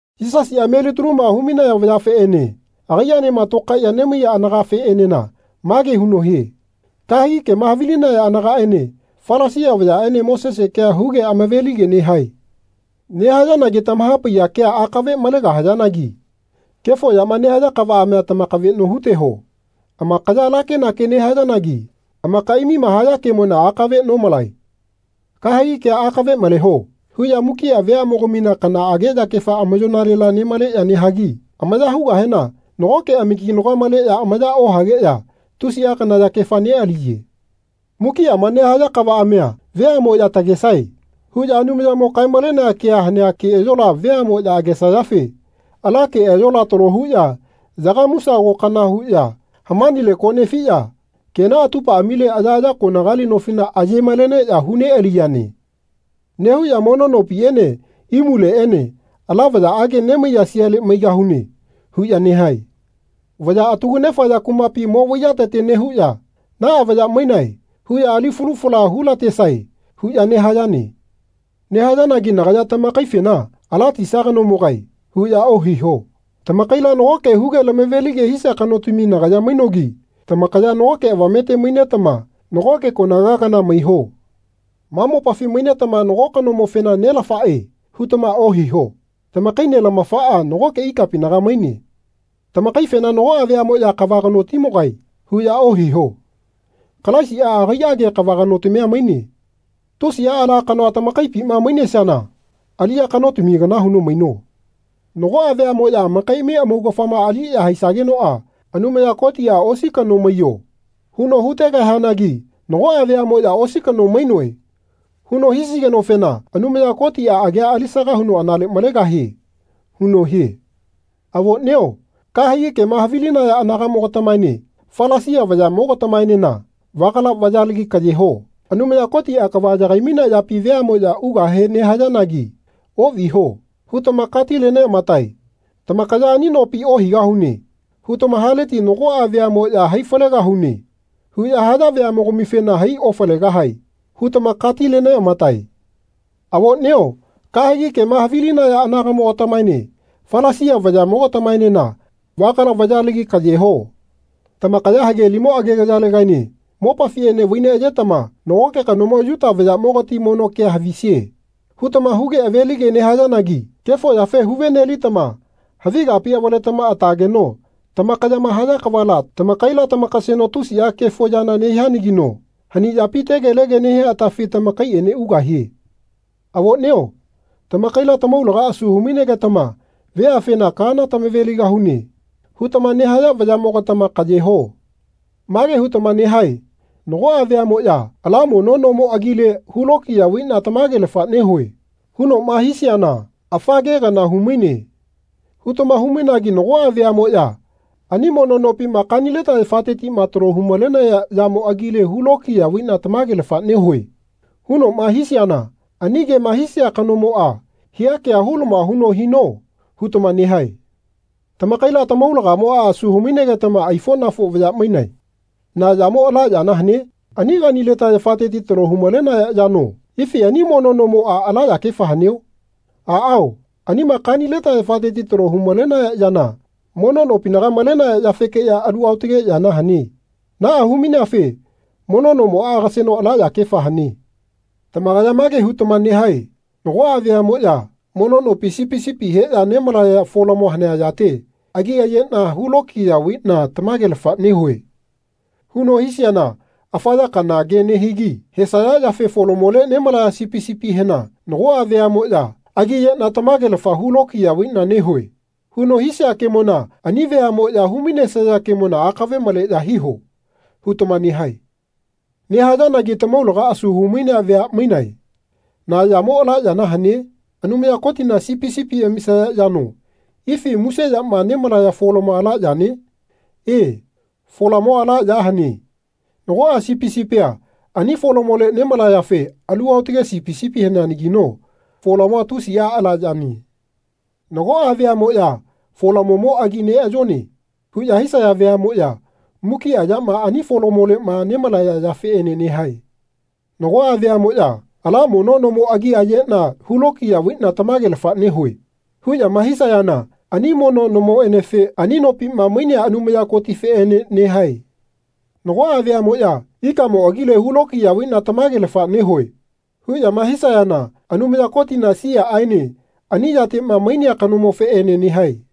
Yisasiꞌa melitaluma hu-maiya vayafeꞌene agaiꞌaenema tokaiꞌya nemaiya anagafeꞌenena mage huno hie kahegi kema havilinaya anagaꞌene Falasia vayaꞌene Mosese kea huge hama-velige nehae. Nehayanagi tamaha-paiya kea akave malegahayanagi kefo yama nehaya kavaꞌamia tamakaveꞌno hu-teho. Amakaya ala kenakea nehayanagi amakaiꞌamima haya kemona akave nomalae. “Kahegi kea akave maleho.” huꞌya mukiꞌa veaꞌmogamina kanaꞌage yakefa amayoꞌnalela nemaleꞌya nehagi amaya hugahena nagoꞌke amakinagoa maleꞌya amaya ohageꞌya tusiꞌa kana yakefa neꞌaliye. Mukiꞌama nehaya kavaꞌamia “Veaꞌmoꞌya tagesae.” huꞌya Anumayamo kae-malenea kea hanea keꞌayola veaꞌmoꞌya agesayafe ala keꞌayola talo huꞌya yagamusago kana huꞌya hamanile ko nefiꞌya kena atupaꞌamile ayaꞌaya konagali nofila aye-maleneꞌya hu-neꞌaliyane. Nehuꞌya mono nopiꞌene imuleꞌene “Ala vayaꞌage nemaiya siale maigahune.” huꞌya nehae. Vaya atagu-nefaya kumapi mo-vaiyatete nehuꞌya “Naꞌa vaya mainae huꞌya ali falu fala hu-la-tesae.” huꞌya nehayane. Nehayanagi nagaya tamakaifena “Ala tisa kanomogae.” huꞌya ohiho. Tamakaila nagoke huge lama-ve-lige hisia kanotami nagaya mainogi tamakaya nagoke avamete mainetama nagoke konaga kana maiho. Ma mopafi mainetama nago kanomofena “Nelafaꞌe.” hutama ohiho. Tamakai Nelamafaꞌa nagoke ikapinaga maine. Tamakaifena nagoꞌa veaꞌmoꞌya “Kava kanotimogae.” huꞌya ohiho. Kalaisiꞌa agaiꞌage kava kanotamia maine. Tusiꞌa ala kanoa tamakaipima mainesiana aliꞌya kanotami kana huno maino. Nagoꞌa veaꞌmoꞌya amakaiꞌami amaugafama aliꞌya haisagenoꞌa Anumaya Kotiꞌa “Osi kano maiyo.” huno hu-tegahianagi nagoꞌa veaꞌmoꞌya “Osi kano mainoe.” huno hisigenofena Anumaya Kotiꞌa agia alisaga huno anale malegahie huno hie. Avoꞌnio kahegi kema havilinaya anagaꞌmogatamaene Falisia vayaꞌmogatamaenena vagala vayalagi kaꞌye ho. Anumaya Kotiꞌa kava yagai-mainea yapi veaꞌmoꞌya ugahe nehayanagi “Oꞌviho.” hutama katile-neꞌamatae. Tamakaya “Ani nopi ohaigahune.” hutama haleti nagoꞌa veaꞌmoꞌya “Hai falegahune.” huꞌya haya veaꞌmogamifena “Hai-ofalegahae.” hutama katile-neꞌamatae. Avoꞌnio kahegi kema havilinaya anagaꞌmogatamaene Falasia vayaꞌmogatamaenena vagala vayalagi kaꞌye ho. Tamakaya hagelimo agegayalegaene mopafiꞌene vai-neꞌayetama “Nagoke kanomo Yuta vayaꞌmogati mono kea havisie.” hutama huge ave-lige nehayanagi kefo yafe hu-ve-nelitama havi kapi avaletama atageno tamakayama haya kavala tamakaila tamakaseno tusiꞌa kefo yana nehianagino hani yapi tegelege nehia atafi tamakaiꞌene ugahie. Avoꞌnio tamakaila tamaulaga asu hu-mainegetama veafena “Kaana tamave-ligahune.” hutama nehaya vayaꞌmogatama kaꞌye ho. Mage hutama nehae “Nagoꞌa veaꞌmoꞌya ‘Ala mono nomo agile hu-lokiya vaiꞌna tamagelafa nehue.’ hunoꞌma hisiana ‘Afa ke kana hu-maine.’ hutama hu-mainagi nagoꞌa veaꞌmoꞌya ‘Ani mono nopima kanileta yafatetiꞌma talo hu-malenaya yamo agile hu-lokiya vaiꞌna tamagelafa nehue.’ hunoꞌma hisiana ani kema hisia kanomoꞌa hia kea hu-lama huno hino.” hutama nehae. Tamakaila tamaulagamoꞌa asu hu-mainegetama aifoꞌnafo vaya mainae. Na yamo ala yana hane? Ani kanileta yafateti talo hu-malenaya yano? Ifi ani mono nomoꞌa ala yakefa haneo? Aꞌao anima kanileta yafateti talo hu-malenaya yana mono nopinaga malenaya yafekeꞌya alu aotage yana hane. Naꞌa hu-maineafe mono nomoꞌa agaseno ala yakefa hane. Tamakaya mage hutama nehae “Nagoꞌa veaꞌmoꞌya ‘Mono nopi sipi sipi heꞌya nemalaya folamo hanea yate agi ayeꞌna hu-lokiya vaiꞌna tamagelafa nehue.’ huno hisiana afa ya kana ke nehigi hesaya yafe folamole nemalaya sipi sipihena nagoꞌa veaꞌmoꞌya ‘Agi ayeꞌna tamagelafa hu-lokiya vaiꞌna nehue.’ huno hisia kemona ani veaꞌmoꞌya hu-mainesaya kemona akave maleꞌya hiho.” hutama nehae. Nehayanagi tamaulaga asu hu-mainea vea mainae. Na yamo ala yana hane? Anumaya Kotina sipi sipi amisaya yano ifi muse yama nemalaya folamoa ala yane? E, folamoa ala ya hane. Nagoꞌa sipi sipia ani folamole nemalayafe alu aotage sipi sipi haneanagino folamoa tusiꞌa ala yane. Nagoꞌa veaꞌmoꞌya “Folamomo agi neꞌayone.” huꞌya hisaya veaꞌmoꞌya mukiꞌa yama ani folamoleꞌma nemalaya yafeꞌene nehae. Nagoꞌa veaꞌmoꞌya “Ala mono nomo agi ayeꞌna hu-lokiya vaiꞌna tamagelafa nehue.” huꞌyama hisayana ani mono nomofeꞌene ani nopima mainea Anumaya Kotifeꞌene nehae. Nagoꞌa veaꞌmoꞌya “Ikamo agile hu-lokiya vaiꞌna tamagelafa nehue.” huꞌyama hisayana Anumaya Kotina siaꞌaene ani yateꞌma mainea kanomofeꞌene nehae.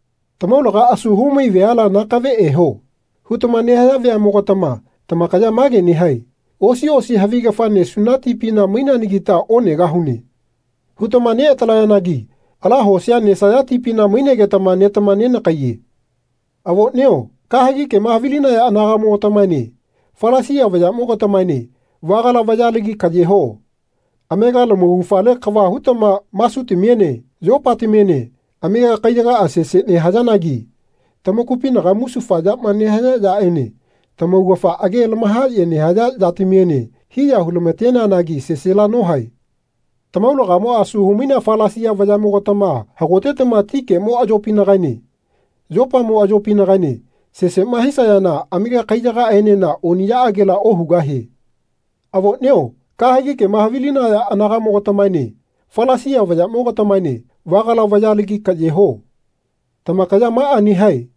Tamaulaga asu hu-mai veala “Nakave eho.” hutama nehaya veaꞌmogatama tamakaya mage nehae “Osi osi havigafa nesuna tipina maineanagita onegahune.” hutama neꞌatalayanagi ala hosia nesaya tipina mainegetama netama nenakaiye. Avoꞌnio kahegi kema havilinaya anagaꞌmogatamaene Falasia vayaꞌmogatamaene vagala vayalagi kaꞌye ho. Amega lamaugafale kava hutama masutamiene yopatamiene amega kaiyagaꞌa sese nehayanagi tamakupinaga musufa yama nehaya yaꞌene tamaugafa age lama-haꞌye nehaya yatamiene hiya hu-lama-teneanagi sesela nohae. Tamaulagamoꞌa asu hu-mainea Falasia vayaꞌmogatama hagotetama ti kemo ayopinagaene yopamo ayopinagaene seseꞌma hisayana amega kaiyagaenena oniꞌyaꞌagela ohugahie. Avoꞌnio kahegi kema havilinaya anagaꞌmogatamaene Falasia vayaꞌmogatamaene vagala vayalagi kaꞌye ho. Tamakaya maꞌa nehae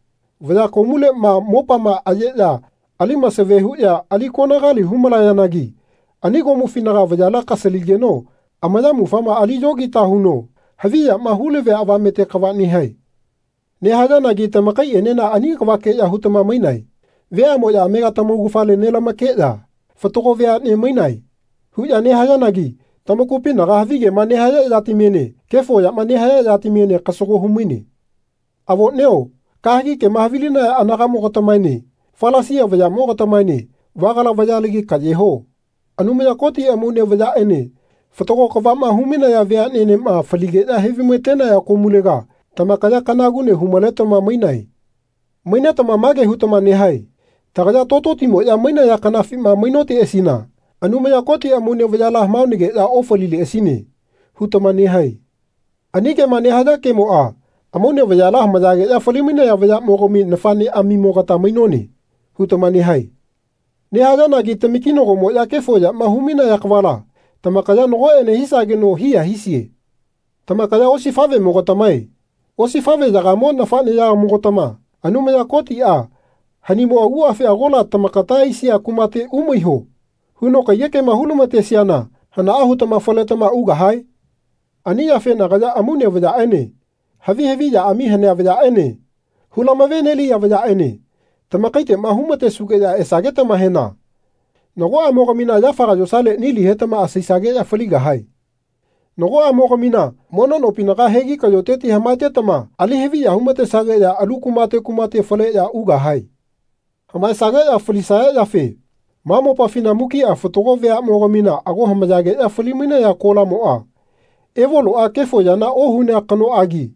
vaya komuleꞌma mopama ayeꞌya ali-masave huꞌya ali konagali hu-malayanagi ani komufinaga vayala kasaligeno ayamufama ali yogita huno havi yama hu-lavia avamete kava nehae. Nehayanagi tamakayaenena ani kavakeꞌya hutama mainae. Veaꞌmoꞌya amega tamaugafale nelamakeꞌya “Fatago veaꞌne mainae.” huꞌya nehayanagi tamakupinaga havigema nehaya yatamiene kefo yama nehaya yatamiene kasago hu-maine. Avoꞌnio kahegi kema havilinaya anagaꞌmogatamaene Falasia vayaꞌmogatamaene vagala vayalagi kaꞌye ho. Anumaya Koti amaune vayaꞌene fatago kavaꞌma hu-mainaya veaꞌnenema faligeꞌya he-vai-ma-tenaya komulega tamakaya kanagune hu-maletama mainae. Mainetama mage hutama nehae “Tagaya tototimoꞌya mainaya kanafima mainoteꞌasina Anumaya Koti amaune vayala hamaonageꞌya ofalileꞌasine.” hutama nehae. Ani kema nehaya kemoꞌa “Amaune vayala hamayageꞌya fali-mainaya vayaꞌmogami nafaꞌneꞌamimogata mainone.” hutama nehae. Nehayanagi tamakinagomoꞌya kefo yama hu-mainaya kavala tamakaya nagoꞌene hisageno hiya hisie. Tamakaya osifaꞌvemogatamae. Osifaꞌveyagamo nafaꞌnemogatama Anumaya Kotiꞌa “Hanimo aguꞌafi agola tamakata aisia kumate umaiho.” huno kaiyekema hu-lama-tesiana hanaꞌa hutama faletama ugahae? Ani yafe nagaya amaune vayaꞌene havi haviꞌyaꞌami hanea vayaꞌene hu-lama-ve-neliya vayaꞌene tamakaiteꞌma hu-ma-tesugeꞌya esagetamahena nagoꞌamogamina yafaga yosale nili hetama asaisageꞌya faligahae. Nagoꞌamogamina mono nopinaga hegi kaꞌyoteti hamaetama ali-haviya hu-matesageꞌya alu kumate kumate faleꞌya ugahae. Hamaesageꞌya falisaya yafe ma mopafina mukiꞌa fatago veaꞌmogamina ago hamayageꞌya fali-mainaya kolamoꞌa Evoloꞌa kefo yana ohunea kanoꞌagi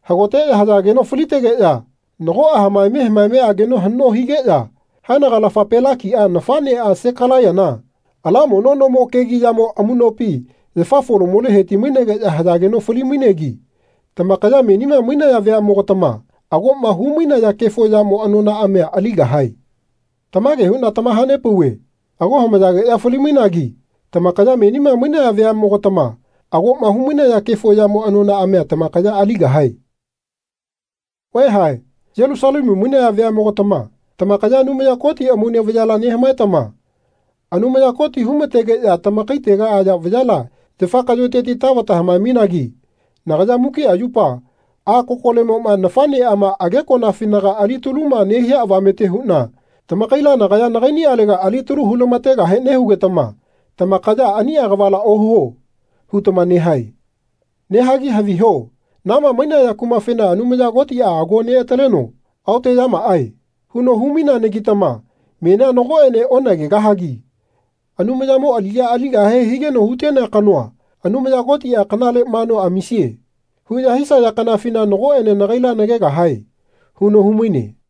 hagoteꞌya hayageno falitegeꞌya nagoꞌa hamaeme hamaeme ageno haꞌno higeꞌya haenagalafa Pelakia nafaꞌnea Sekalaiyana ala mono nomo kegiꞌyamo amuꞌnopi yafa folamole heti-mainegeꞌya hayageno fali-mainegi tamakaya menima mainaya veaꞌmogatama agoꞌma hu-mainaya kefo yamo anonaꞌamia aligahae. Tamage huꞌna tamaha-nepauve ago hamayageꞌya fali-mainagi tamakaya menima mainaya veaꞌmogatama agoꞌma hu-mainaya kefo yamo anonaꞌamia tamakaya aligahae. Vaeha Yelusalemu mainaya veaꞌmogatama tamakaya Anumaya Koti amaune vayala nehamaetama Anumaya Koti hu-ma-tegeꞌya tamakaitega aya vayala yafa kaꞌyoteti tavata hamae-mainagi nagaya mukiꞌa yupa a kokolemoꞌma nafaꞌneꞌama agekoꞌnafinaga alitaluma nehia avamete huꞌna tamakaila nagaya nagaiꞌniꞌalega alitalu hu-lama-tegahe nehugetama tamakaya “Aniꞌa kavala ohuo.” hutama nehae. Nehagi haviho na ma mainaya kumafena Anumaya Kotiꞌa ago neꞌataleno “Aoteꞌyamaꞌae.” huno hu-maineanagitama menia nagoꞌene onagegahagi “Anumayamo aliꞌya aligahe higeno hu-tenea kanoa Anumaya Kotiꞌa kanale manua amisie.” huꞌya hisaya kanafina nagoꞌene nagaila nagegahae huno hu-maine.